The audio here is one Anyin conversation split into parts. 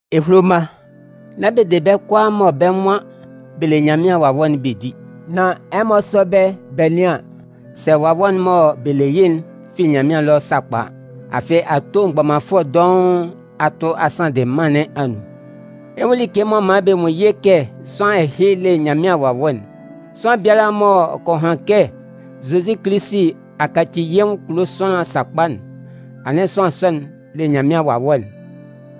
Ehulo mma, nán bɛ de bɛ́ kʋalaa mɔ bɛ́ nwan bɛ le Nyanmɩan Wawɛ'n bɛ di. Nan ɛmɔ sɔ́ bɛ́ bɛ nɩ́an sɛ wawɛ'n mɔ bɛ le yɩ́'n fi Nyanmɩan ɛlɔ sakpa a. Afɩ ato mgbɔmanfʋɛ dɔʋn a tʋ a sanndɩ mân nɩn anun. Ɛ 'nwun like m'ɔ man bɛ nwun yɩ́ kɛ sʋanlan ɛhɩ le Nyanmɩan Wawɛ'n: Sʋanlan biala m'ɔ kɔ han kɛ Zozi Kilisi a kaci yɩ́ nwʋn kulo sʋanlan sakpa'n, anɩn sʋanlan sɔ'n le Nyanmɩan Wawɛ'n.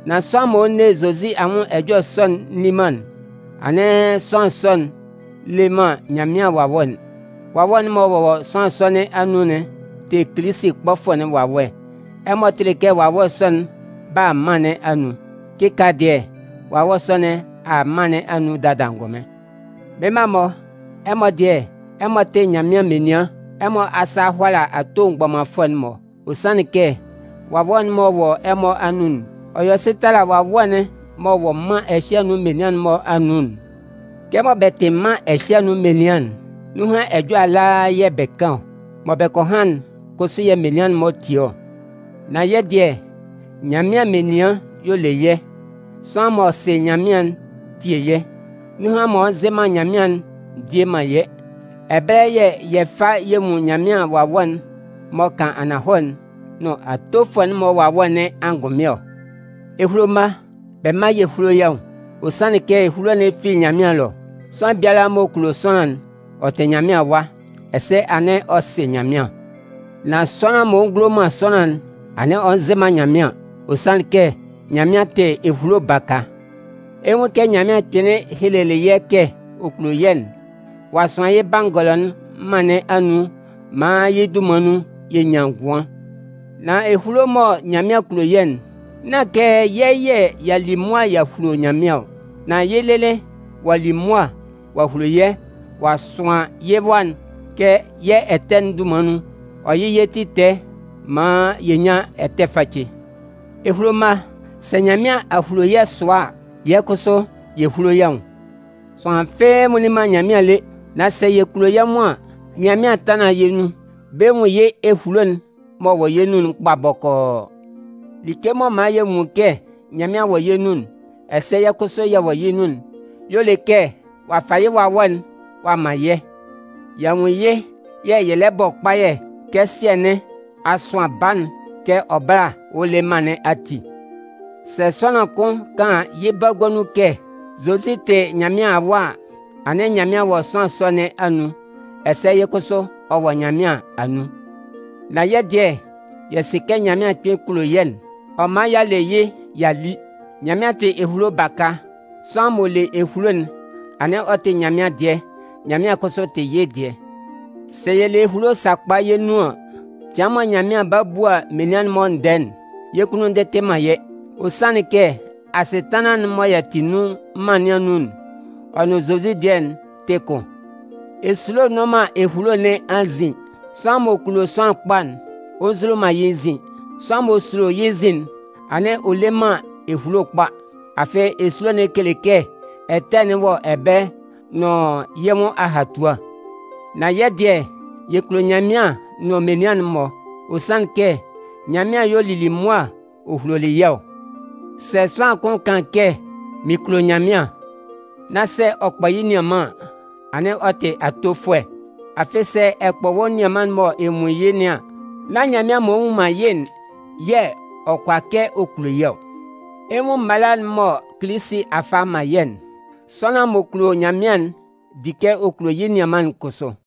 Nan sʋanlan m'ɔ nne Zozi anwʋn ɛjɔlɛ sɔ'n nni man'n, anɩn sʋanlan sɔ'n le man Nyanmɩan Wawɛ'n. Wawɛ'n m'ɔ wɔ sʋanlan sɔ nɩn anun'n tɩ Kilisi kpɔfʋɛ'n wawɛ. Ɛmɔ tɩlɩ kɛ wawɛ sɔ'n 'ba a mân nɩn anun. Kɩkaala dɩɛ, wawɛ sɔ nɩn a a mân nɩn anun dada angʋnmɩn. Mɩ́n mma-mɔ, ɛmɔ dɩɛ, ɛmɔ tɩ Nyanmɩan menian. Ɛmɔ asa a hʋala ato mgbɔmanfʋɛ'n-mɔ. Ɔ sanlɩn kɛ Wawɛ'n m'ɔ wɔ ɛmɔ anun'n, ɔ yɔ sɩ tala wawɛ'n m'ɔ wɔ mân ɛhɩ anun menian'n-mɔ anun'n. Kɛmɔ bɛ tɩ mân ɛhɩ anun menian'n, nunhan ɛjɔlɛ ala yɛ̂ bɛ kan ɔ. Mɔ bɛ kɔ han'n kʋsʋ yɛ̂ menian'n-mɔ tie ɔ. Nan yɛ́ dɩɛ, Nyanmɩan menian y'ɔ le yɛ́. Sʋanlan m'ɔ sɩ Nyanmɩan'n tie yɛ́. Nunhan m'ɔ nzɩ man Nyanmɩan'n ndie man yɛ́. Ɛbɛlɛ yɛ̂ yɛ fa yɛ nwun Nyanmɩan Wawɛ'n m'ɔ kan ananhɔlɛ'n nʋn atofʋɛ'n-mɔ wawɛ nɩn angʋnmɩn ɔ. Ehulo mma, bɛ mán yɛ húlo yɛ́ nwʋn. Ɔ sanlɩn kɛ ehulo'n fi Nyanmɩan ɛlɔ. Sʋanlan biala m'ɔ kulo sʋanlan'n, ɔ tɩ Nyanmɩan awa, ɛsɛ anɩn ɔ sɩ Nyanmɩan. Nan sʋanlan m'ɔ ngulo man sʋanlan'n, anɩn ɔ nzɩ man Nyanmɩan. Ɔ sanlɩn kɛ Nyanmɩan tɩ ehulo baka. Ɛ 'nwun kɛ Nyanmɩan kpɩnlɩn helelɩ yɛ́ kɛ ɔ kulo yɛ́'n: ɔ'a sʋan yɩ́ Bangɔlɔ'n mân nɩn anun maan yɩ́ dunman nun, yɛ nyan ngʋan. Nan ehulo'n mɔ Nyanmɩan kulo yɛ́'n, nán kɛ yɛ́ yɛ̂ y'a li mʋa y'a hulo Nyanmɩan ɔ. Nan yɩ́ lɩlɩ ɔ'a li mʋa ɔ'a hulo yɛ́ ɔ'a sʋan yɩ́ Wa'n kɛ yɛ́ ɛtɛ'n-mɔ dunman nun, ɔ yɩ́ yɛ́ ti tɛɛ maan yɛ nyán ɛtɛ facɛ. Ehulo mma, sɛ Nyanmɩan a hulo yɛ́ sʋa a, yɛ́ kʋsʋ yɛ húlo yɛ́ nwʋn. Sʋanlan fɩ́ɩ́ nwunlin man Nyanmɩan lé. Nan sɛ yɛ kulo yɛ́ nwʋn an, Nyanmɩan 'tanlan yɛ́ nun bɛ nwun yɩ́ ehulo'n m'ɔ wɔ yɛ́ nun'n kpa bɔkɔɔ. Like m'ɔ man yɛ nwun kɛ Nyanmɩan wɔ yɛ́ nun, ɛsɛ yɛ́ kʋsʋ yɛ wɔ yɩ́ nun'n, y'ɔ le kɛ ɔ'a fa yɩ́ Wawɛ'n ɔ'a man yɛ́. Y'a nwun yɩ́ yɛ̂ yɛ lɛ bɔ kpayɛ kɛ Sɩɛ nɩn a sʋan Baa'n kɛ ɔ bála a le mân nɩn ati. Sɛ sʋanlan kʋn kan yɩ́ bagua nun kɛ Zozi tɩ Nyanmɩan Awa a, anɩn Nyanmɩan wɔ sʋanlan sɔ nɩn anun ɛsɛ yɩ́ kʋsʋ ɔ wɔ Nyanmɩan anun. Nan yɛ́ dɩɛ, yɛ sɩ kɛ Nyanmɩan kpɩn kulo yɛ́'n, ɔ man y'a le yɩ́ y'a li. Nyanmɩan tɩ ehulo baka. Sʋanlan m'ɔ le ehulo'n, anɩn ɔ tɩ Nyanmɩan dɩɛ, Nyanmɩan kʋsʋ tɩ yɩ́ dɩɛ. Sɛ yɛ le ehulo sakpa yɛ́ nun an, cɩan mɔ Nyanmɩan 'ba bua menian'n-mɔ ndɛɛ'n, yɛ́ kunnun ndɩtɩ man yɛ́. Ɔ sanlɩn kɛ asɩtanlan'n mɔ yɛ tɩ nun mân nɩn anun'n, ɔ nʋn Zozi dɩɛ'n tɩ kʋn. Esulo nnʋn man ehulo nɩn anzin. Sʋanlan m'ɔ kulo sʋanlan kpa'n, ɔ nzulo man yɩ́ nzin. Sʋanlan m'ɔ sulo yɩ́ nzin'n, anɩn ɔ le man ehulo kpa. Afɩ, esulo'n kele kɛ ɛtɛ'n wɔ ɛbɛlɛ nʋn yɩ́ nwʋn ahatua. Nan yɛ́ dɩɛ, yɛ kulo Nyanmɩan nʋn menian'n-mɔ, ɔ sanlɩn kɛ Nyanmɩan y'ɔ lili mʋa ɔ hulolɩ yɛ́ ɔ. Sɛ sʋanlan kʋn kan kɛ: “Mɩn kulo Nyanmɩan” nán sɛ ɔ kpɔ yɩ́ nianman an, anɩn ɔ tɩ atofʋɛ. Afɩ, sɛ ɔ kpɔ yɩ́ nianman'n m'ɔ nwun yɩ́ nɩn an, nán Nyanmɩan m'ɔ nnwun man yɩ́'n yɛ̂ ɔ kʋala kɛ ɔ kulo yɩ́ ɔ. Ɛ 'nwun mala'n mɔ Kilisi a fa a man yɛ́'n. Sʋanlan m'ɔ kulo Nyanmɩan'n di kɛ ɔ kulo yɩ́ nianman'n kʋsʋ.